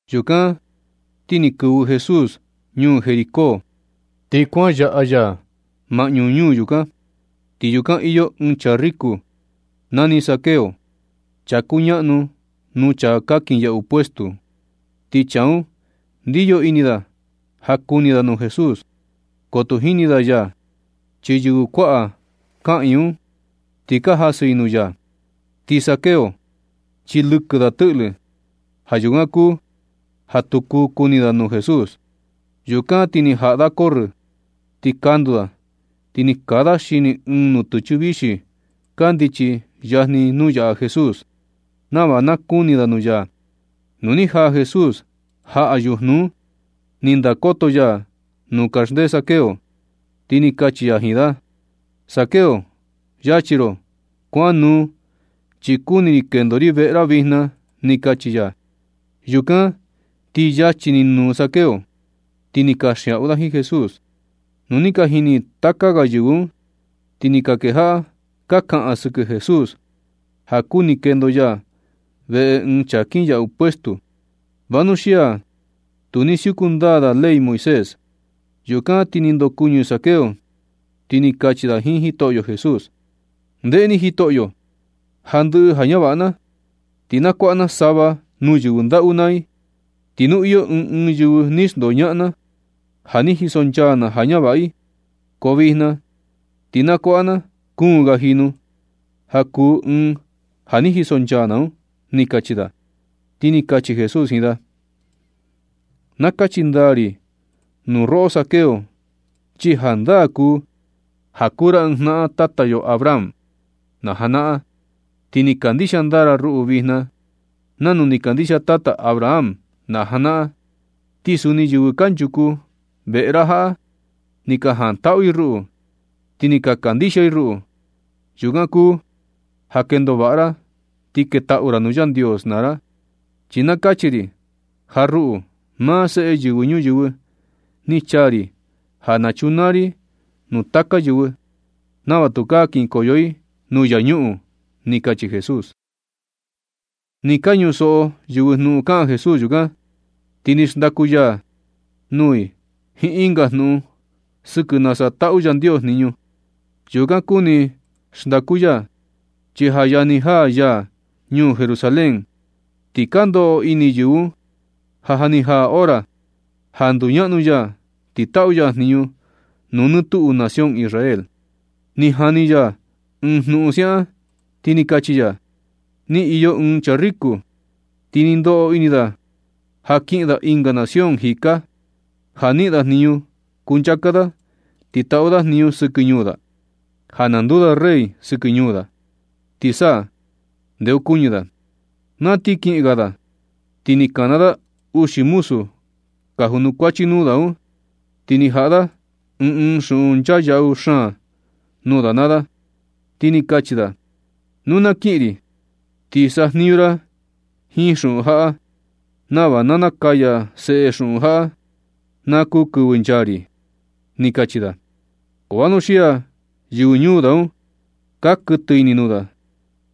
Yukan ti ni kɨvɨ Jesús ñuu Jericó, ti kuan yaꞌa ya maꞌñu ñuu yukan, ti yukan iyo ɨɨn chaa riko nani Zaqueo, chaa kuñaꞌnu nuu chaa ka kinyaꞌu puesto un. Ti chaa un ndiyo ini da ja kuni da nuu Jesús, ko tu jini da ya chi yɨvɨ kuaꞌa kaꞌiin un ni jasɨ i nuu ya. Ti Zaqueo chi lɨkɨ da tɨꞌlɨ. Ja yukan kuu ja tu kuu kuni da nuu Jesús. Yukan ti ni jaꞌa da corrɨ ni kandu da ti ni kaa da xini ɨɨn nutɨchɨ vixi kandichi yajni nuu yaꞌa Jesús, nava na kuni da nuu ya. Nu ni jaa Jesús jaꞌa yujnu un, ni ndakoto ya nuu kaxndee Zaqueo, ti ni kachi ya jiin da: ―Zaqueo, yachi ro ti kuan nuu, chi kuni ri kendo ri veꞌe ra vijna ―ni kachi ya. Yukan ti yachi ni nuu Zaqueo, ti ni kanxiaꞌu da jiin Jesús. Nu ni ka jini taka ga yɨvɨ un, ti ni ka kejaꞌa ka kaꞌan sɨkɨ Jesús ja kuni kendo ya veꞌe ɨɨn chaa kinyaꞌu puesto, vanuxia tu ni siuku ndaa da ley Moisés. Yukan ti ni ndokuɨñɨ Zaqueo, ti ni kachi da jiin Jitoꞌyo Jesús: ―Ndeꞌe ni Jitoꞌyo. Ja ndɨꞌɨ ja ñavaꞌa na, ti na kuaꞌa na sava nuu yɨvɨ ndaꞌu naa i, ti nu iyo ɨɨn ɨɨn yɨvɨ ni xndoñaꞌan na ja ni jisonchaa na ja ñavaꞌa i, ko vijna ti na nakuaꞌa na kuun ga jinu ja kuu ɨɨn ja ni jisonchaa na un ―ni kachi da. Ti ni kachi Jesús jiin da: ―Na kachi ndaa ri nuu roꞌo Zaqueo chi jandaa kuu ja kuu ra ɨɨn jnaꞌan tata yo Abraham na janaꞌan, ti ni kandixia ndaa ra ruꞌu vijna nanu ni kandixia tata Abraham na janaꞌan. Ti suni yɨvɨ kanchuku veꞌe ra jaꞌa ni ka jantaꞌu i ruꞌu, ti ja ni ka kandixia i ruꞌu. Yukan kuu ja kendo vaꞌa ra ti ketaꞌu ra nuu Yandios naa ra. Chi na kachi ri ja ruꞌu, maa Seꞌe Yɨvɨ Ñuyɨvɨ ni chaa ri ja na chunaa ri nuu taka yɨvɨ nava tukaa kinkoyo i nuu infiernu ―ni kachi Jesús. Nɨ ka ñusoꞌo yɨvɨ jnuꞌun kaꞌan Jesús yukan, ti ni xndaku ya nuu i jiin ɨnga jnuꞌun sɨkɨ nasa taꞌu Yandios jniñu. Yukan kuni xndaku ya, chi ja yajni jaa ya ñuu Jerusalén, ti ka ndoꞌo ini yɨvɨ un ja ja ni jaa hora ja nduñaꞌnu ya ti taꞌu ya jniñu nuu nɨ tuꞌu nación Israel. Ni ja ni ya ɨɨn jnuꞌun siaꞌan, ti ni kachi ya: ―Ni iyo ɨɨn chaa riko, ti ni ndoꞌo ini da ja kiꞌin da ɨnga nación jika, ja niꞌin da jniñu kunchaa da ti taꞌu da jniñu sɨkɨ ñuu da, ja na nduu da rey sɨkɨ ñuu da, ti sa ndeokuñɨ da. Na ti kiꞌin ga da, ti ni kana da uxi muzu ka junukuachi nuu da un, ti ni jaꞌa da ɨɨn ɨɨn xuꞌun nchaa yaꞌu xaan nuu da naa da, ti ni kachi da: “Nu na kiꞌin ri ti sajniñu naa ra jiin xuꞌun jaꞌa nava na nakaya seꞌe xuꞌun jaꞌa ja kuu kɨvɨ nchaa ri”, ni kachi da. Ko vanuxia yɨvɨ ñuu da un ka kuɨtɨ ini nuu da,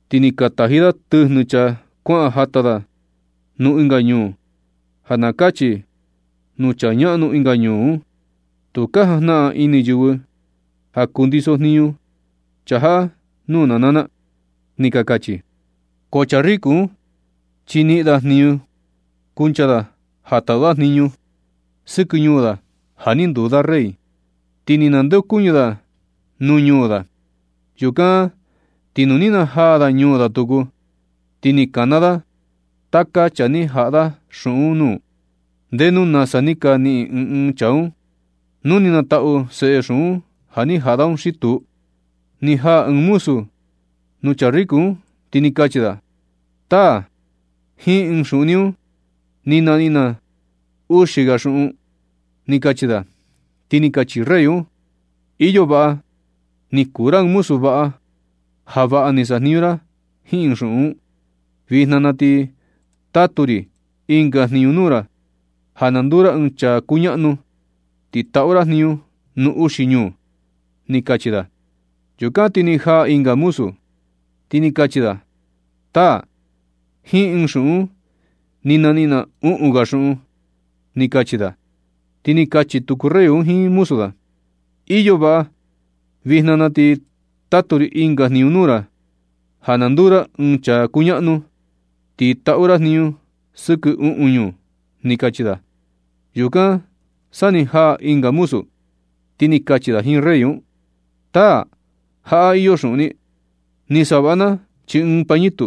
ti ni ka taji da tɨjnu chaa kuaꞌan jata da nuu ɨnga ñuu, ja na kachi nuu chaa ñaꞌnu ɨnga ñuu un: “Tu ka jajnaꞌan ini yɨvɨ ja kundiso jniñu chaa jaꞌa nuu na naa na”, ni ka kachi. Ko chaa riku un, chi ni niꞌin da jniñu kuncha da ja taꞌu da jniñu sɨkɨ ñuu da ja ni nduu da rey, ti ni nandeokuñɨ da nuu ñuu da. Yukan ti nu ni najaa da ñuu da tuku, ti ni kana da taka chaa ni jaꞌa da xuꞌun un nuu, ndenu nasa ni ka niꞌin ɨɨn ɨɨn chaa un, nu ni ka nataꞌu seꞌe xuꞌun ni jaꞌa da un xi tuu. Ni jaa ɨɨn muzu nuu chaa riko un, ti ni kachi da: “Taa, jiin ɨɨn xuꞌun ni un ni naniꞌin na uxi ga xuꞌun”, ni kachi da. Ti ni kachi rey un: “Iyo vaꞌa, ni kuu ra ɨɨn muzu vaꞌa, ja vaꞌa ni saꞌa jniñu ra jiin ɨɨn xuꞌun un. Vijna na ti na tatu ri ɨnga jniñu nuu ra ja na nduu ra ɨɨn chaa kuñaꞌnu, ti taꞌu ra jniñu nuu uxi ñuu”, ni kachi da. Yukan ti ni jaa ɨnga muzu, ti ni kachi da: “Taa, jiin ɨɨn xuꞌun un ni naniꞌin na uꞌun ga xuꞌun”, ni kachi da. Ti ni kachi tuku rey un jiin muzu da: “Iyo vaꞌa. Vijna na ti na tatu ri ɨnga jniñu nuu ra ja na nduu ra ɨɨn chaa kuñaꞌnu, ti taꞌu ra jniñu sɨkɨ uꞌun ñuu”, ni kachi da. Yukan sa ni jaa ɨnga muzu, ti ni kachi da jiin rey un: “Taa, jaꞌa iyo xuꞌun ni. Ni savaꞌa na chii ɨɨn pañitu.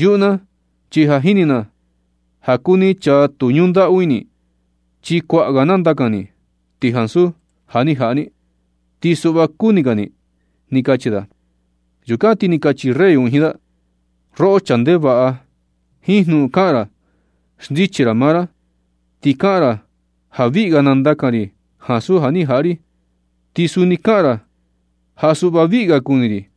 Yuꞌu na chi ja jini na ja kuu ni chaa tu ñundaꞌu ini, chi kuaꞌa ga nandakan ni, ti ansu ja ni jaꞌa ni, ti suꞌva kuni ga ni”, ni kachi da. Yukan ti ni kachi rey un jiin da: “Roꞌo chaa ndevaꞌa, jiin jnuꞌun kaꞌan ni ra xndichi ra maa ra. Ti kaꞌan ra ja viꞌi ga nandakan ri ansu ja ni jaꞌa ri. Ti suni kaꞌan ra ja suꞌva viꞌi ga kuni ri.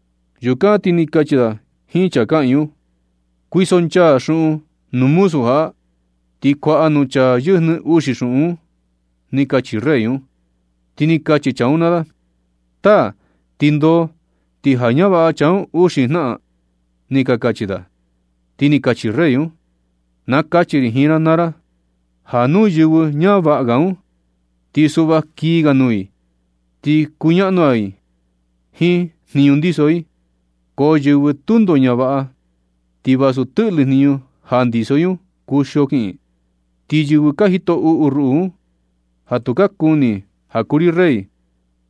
Yukan ti ni kachi da jiin chaa kaꞌiin un: “Kuisonchaa xuꞌun nuu muzu jaꞌa, ti kuaꞌa nuu chaa yɨjnɨ uxi xuꞌun un”, ni kachi rey un. Ti ni kachi chaa un naa da: “Taa, ti ndoo ti ja ñavaꞌa chaa un uxi jnaꞌan”, ni ka kachi da. Ti ni kachi rey un: “Na kachi ri jiin ra naa ra ja nu yɨvɨ ñavaꞌa un, ti suꞌva kii ga nuu i, ti kuñaꞌnu ga i jiin jniñu ndiso i. Ko yɨvɨ tundo ñavaꞌa, ti vasu tɨꞌlɨ jniñu ja ndiso i un, kuxio kiꞌin. Ti yɨvɨ ka jito uꞌu ruꞌu un, ja tu ka kuni ja kuu ri rey,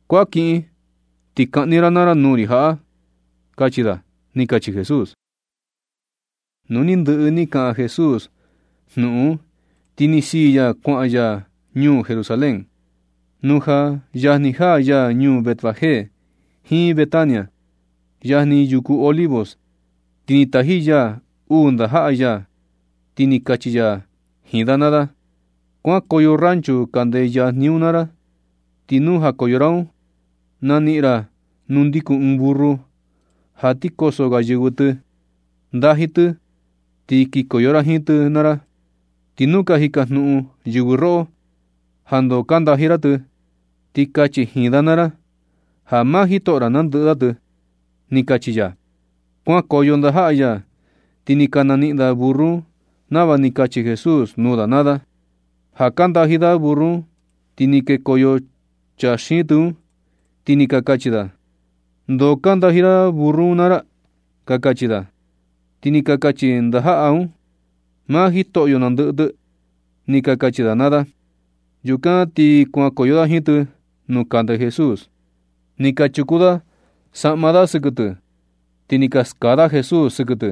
kuan kiꞌin ti kaꞌni ra naa ra nuu ri jaꞌa”, kachi da ―ni kachi Jesús. Nu ni ndɨꞌɨ ni kaꞌan Jesús jnuꞌun un, ti ni siin ya kuaꞌan ya ñuu Jerusalén. Nu ja yajni jaa ya ñuu Betfagé jiin Betania, yajni yuku Olivos, ti ni taji ya uu ndajaꞌa ya, ti ni kachi ya jiin da naa da: ―Kuankoyo rancho kande yajni un naa ra, ti nu jakoyo ra un, naniꞌin ra nuu ndikun ɨɨn burru ja ti koso ga yɨvɨ tɨ. Ndaji tɨ ti kikoyo ra jiin tɨ naa ra. Ti nu ka jikajnuꞌun yɨvɨ roꞌo ja ndoo ka ndaji ra tɨ, ti kachi jiin da naa ra ja maa Jitoꞌo ra nandɨꞌɨ da tɨ ―ni kachi ya. Kuankoyo ndajaꞌa ya, ti ni ka naniꞌin da burru un nava ni kachi Jesús nuu da naa da. Ja ka ndaji da burru un ti ni kekoyo chaa xiin tɨ un, ti ni ka kachi da: ―¿Ndoo ka ndaji ra burru un naa ra? ―ka kachi da. Ti ni ka kachi ndajaꞌa un: ―Maa Jitoꞌyo nandɨꞌɨ tɨ ―ni ka kachi da naa da. Yukan ti kuankoyo da jiin tɨ nuu kande Jesús, ni ka chuku da saꞌma da sɨkɨ tɨ, ti ni ka skaa da Jesús sɨkɨ tɨ.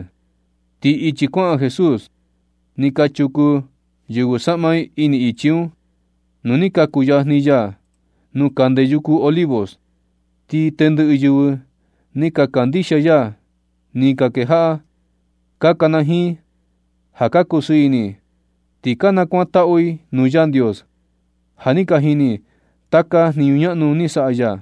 Ti ichi kuaꞌan Jesús ni ka chuku yɨvɨ saꞌma i ini ichi un. Nu ni ka kuyajni ya nuu kande yuku Olivos, ti tendɨꞌɨ yɨvɨ ni ka kandixia ya ni ka kejaꞌa ka kanajiin ja ka kusɨɨ ini ti ka nakuantaꞌu i nuu Yandios ja ni ka jini i taka jniñu ñaꞌnu ni saꞌa ya.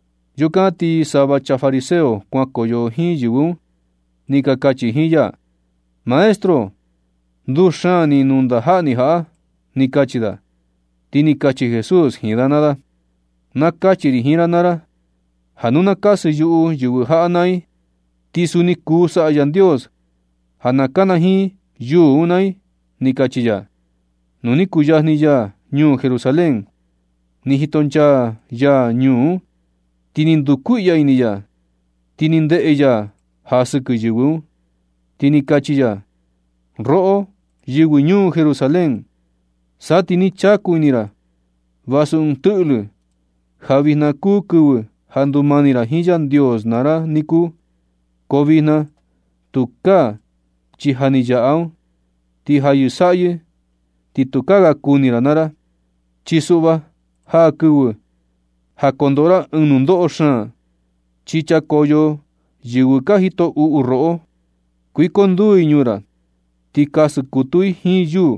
Yukan ti sava chaa fariseo kuan koyo jiin yɨvɨ un, ni ka kachi jiin ya: ―Maestro, nduxaan ni nuu ndajaꞌa ni jaꞌa ―ni kachi da. Ti ni kachi Jesús jiin da naa da: ―Na kachi ri jiin ra naa ra, ja nu na kasɨ yuꞌu yɨvɨ jaꞌa na i, ti suni kuu saꞌa Yandios ja na kanajiin yuu un naa i ―ni kachi ya. Nu ni kuyajni ya ñuu Jerusalén, ni jitonchaa ya ñuu un, ti ni ndukuiꞌya ini ya. Ti ni ndeꞌe ya ja sɨkɨ yɨvɨ un, ti ni kachi ya: ―Roꞌo, yɨvɨ ñuu Jerusalén, sa ti ni ka chaku ini ra vasu ɨɨn tɨꞌlɨ ja vijna kuu kɨvɨ ja ndumani ra jiin Yandios naa ra niku, ko vijna tukaa chi ja ni yaꞌa un, ti ja yɨsaꞌyɨ, ti tukaa ga kuni ra naa ra. Chi suꞌva, jaa kɨvɨ ja kondoꞌo ra ɨɨn nundoꞌo xaan, ti chakoyo yɨvɨ ka jito uꞌu roꞌo, kuikonduu i ñuu ra, ti kasɨ kutu i jiin yuu,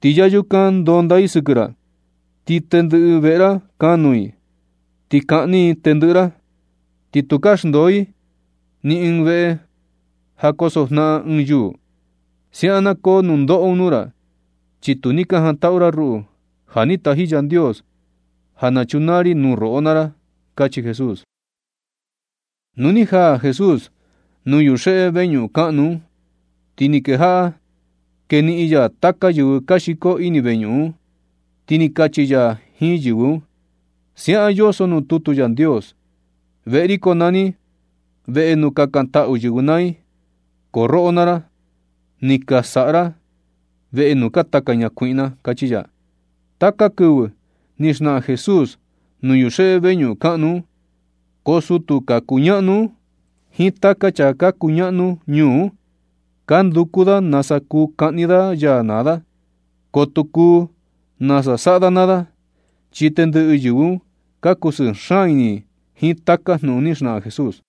ti ya yukan ndonda i sɨkɨ ra. Ti ndɨꞌɨ veꞌe ra kanuu i, ti kaꞌni i tendɨꞌɨ ra. Ti tukaa xndoo i ni ɨɨn veꞌe ja kosojnaꞌan ga ɨɨn yuu. Siaꞌan na koo nundoꞌo un nuu ra chi tu ni ka jantaꞌu ra ruꞌu, ja ni taji Yandios ja chunaa ri nuu roꞌo naa ra ―kachi Jesús. Nu ni jaa Jesús nuu yuxeꞌe veñuꞌun kaꞌnu un, ti ni kejaꞌa keniꞌin ya taka yɨvɨ ka xiko ini veñuꞌun un. Ti ni kachi ya jiin yɨvɨ un: ―Siaꞌan yoso nuu tutu Yandios: “Veꞌe ri konani veꞌe nuu kakantaꞌu yɨvɨ naa i”, ko roꞌo naa ra, ni ka nasaꞌa ra veꞌe nuu ka nataka ñakuiꞌna ―kachi ya. Taka kɨvɨ ni xnaꞌan Jesús nuu yuxeꞌe veñuꞌun kaꞌnu un, ko sutu ka kuñaꞌnu un jiin taka chaa ka kuñaꞌnu ñuu un, ka nduku da nasa kuu kaꞌni da ya naa da. Ko tu kuu nasa saꞌa da naa da, chi tendɨꞌɨ yɨvɨ un ka kusɨɨ xaan ini i jiin taka jnuꞌun ni xnaꞌan Jesús.